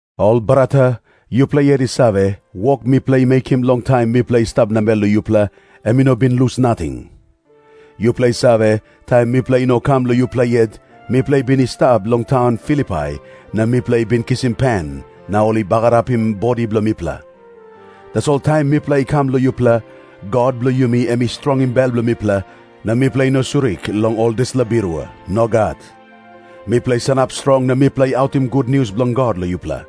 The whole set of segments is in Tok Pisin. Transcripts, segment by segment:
Ol brata, yupela yet i save, wok mipela i mekim long taim mipela i stap namel long yupela, em i no bin lus nating. Yupela i save, taim mipela i no kam long yupela yet, mipela i bin i stap long taun Filipai, na mipela i bin kisim pen, na ol i bagarapim bodi bilong mipela. Tasol taim mipela i kam long yupela, God bilong yumi em i strongim bel bilong mipela, na mipela i no surik long ol dispela birua. Nogat. Mipela i sanap strong na mipela i autim gutnius bilong God long yupela.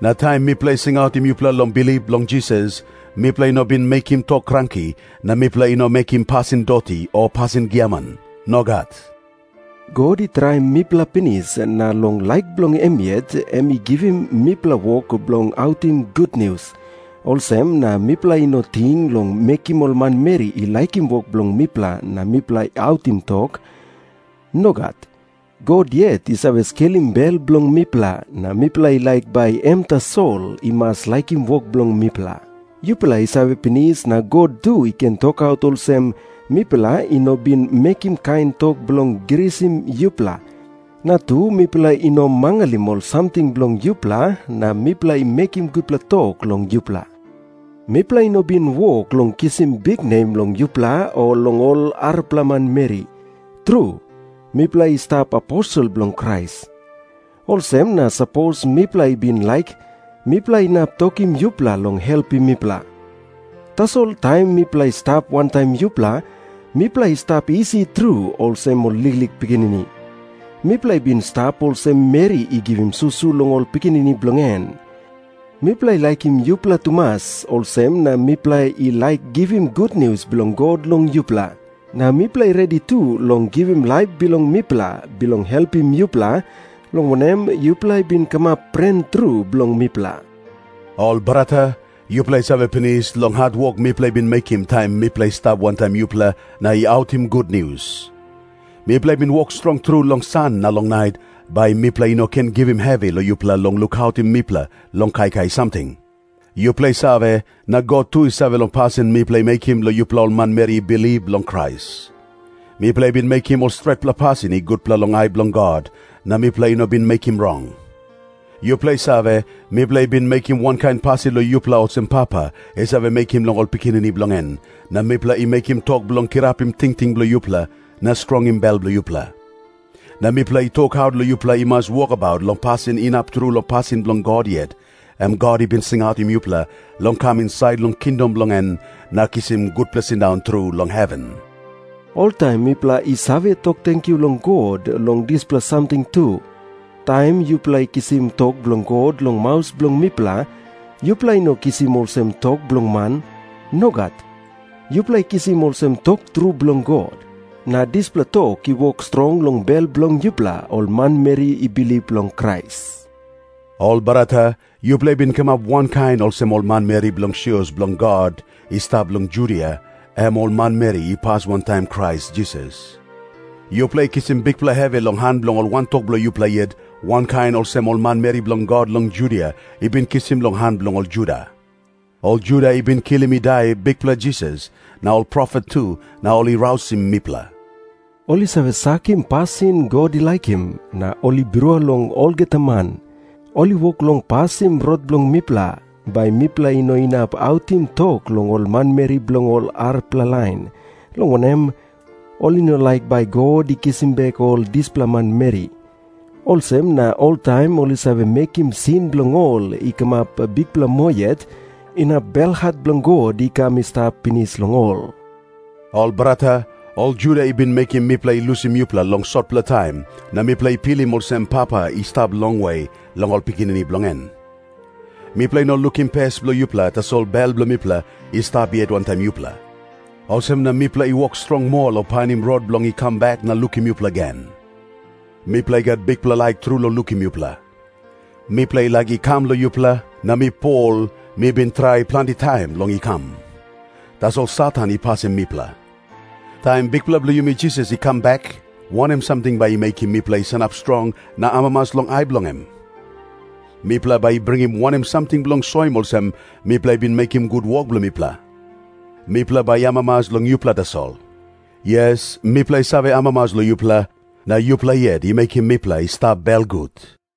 Na taim mipela i singautim yupela long bilip long Jisas, mipela i no bin mekim tok kranki, na mipela i no mekim pasin doti o pasin giaman. Nogat. God i traim mipela pinis na long laik bilong em yet em i givim mipela wok bilong autim gutnius, olsem na mipela i no ting long mekim ol manmeri i laikim wok bilong mipela na mipela i autim tok. Nogat. God yet i save skelim bel bilong mipela, na mipela i laik bai em tasol i mas laikim wok bilong mipela. Yupela i save pinis na God tu i ken tokaut olsem, mipela i no bin mekim kain tok bilong grisim yupela, na tu mipela i no mangalim ol samting bilong yupela na mipela i mekim gutpela tok long yupela. Mipela i no bin wok long kisim biknem long yupela o long ol arapela manmeri. Tru, mipela i stap aposel bilong Krais. Olsem na sapos mipela i bin laik, mipela inap tokim yupela long helpim mipela. Tasol taim mipela i stap wantaim yupela, mipela i stap isi tru olsem ol liklik pikinini. Mipela i bin stap olsem meri i givim susu long ol pikinini bilong en. Mipela i laikim yupela tumas, olsem na mipela i laik givim gutnius bilong God long yupela. Na mipela i redi tu long givim laip bilong mipela bilong helpim yupela, long wanem, yupela i bin kamap pren tru bilong mipela. Ol brata, yupela i save pinis long hatwok mipela i bin mekim taim mipela i stap wantaim yupela na i autim gutnius. Mipela i bin wok strong tru long san na long nait, bai mipela i no ken givim hevi long yupela long lukautim mipela long kaikai samting. Yupela i save, na God tu i save long pasin mipela i mekim long yupela ol manmeri i bilip long Krais. Mipela i bin mekim ol stretpela pasin i gutpela long ai bilong God, na mipela i no bin mekim rong. Yupela i save, mipela i bin mekim wankain pasin long yupela olsem papa i save mekim long ol pikinini bilong en, na mipela i mekim tok bilong kirapim tingting bilong yupela na strongim bel bilong yupela. Na mipela i tokaut long yupela i mas wokabaut long pasin inap tru long pasin bilong God yet, em God i bin singautim yupela long kam insait long kingdom bilong en na kisim gutpela sindaun tru long heven. Oltaim mipela i save tok tenkyu long God long dispela samting tu. Taim yupela i kisim tok bilong God long maus bilong mipela, yupela i no kisim olsem tok bilong man. Nogat. Yupela i kisim olsem tok tru bilong God. Na dispela tok i wok strong long bel bilong yupela ol manmeri i bilip long Krais. Ol brata, yupela i bin kamap wankain olsem ol manmeri bilong sios bilong God i stap long Judia, em ol manmeri i pas wantaim Krais Jisas. Yupela i kisim bikpela hevi long han bilong ol wantok bilong yupela yet, wankain olsem ol manmeri bilong God long Judia i bin kisim long han bilong ol Juda. Ol Juda i bin kilim i dai Bikpela Jisas na ol profet tu, na ol i rausim mipela. Ol i save sakim pasin God i laikim, na ol i birua long olgeta man. Ol i wok long pasim rot bilong mipela, bai mipela i no inap autim tok long ol manmeri bilong ol arapela lain, long wanem, ol i no laik bai God i kisim bek ol dispela manmeri. Olsem na oltaim ol i save mekim sin bilong ol i kamap bikpela moa yet, inap belhat bilong God i kam i stap pinis long ol. Ol brata, ol Juda i bin mekim mipela i lusim yupela long sotpela taim, na mipela i pilim olsem papa i stap longwe long ol pikinini bilong en. Mipela i no lukim pes bilong yupela, tasol bel bilong mipela i stap yet wantaim yupela. Olsem na mipela i wok strong moa long painim rot bilong i kam bek na lukim yupela gen. Mipela i gat bikpela laik tru long lukim yupela. Mipela i laik i kam long yupela, na mi Pol, mi bin trai planti taim long i kam. Tasol Satan i pasim mipela. Taim Bikpela bilong yumi Jisas i kam bek, wanem samting bai i mekim mipela i sanap strong na amamas long ai bilong em? Mipela bai i bringim wanem samting bilong soim olsem mipela i bin mekim gut wok bilong mipela? Mipela bai i amamas long yupela tasol. Yes, mipela i save amamas long yupela, na yupela yet i mekim mipela i stap belgut.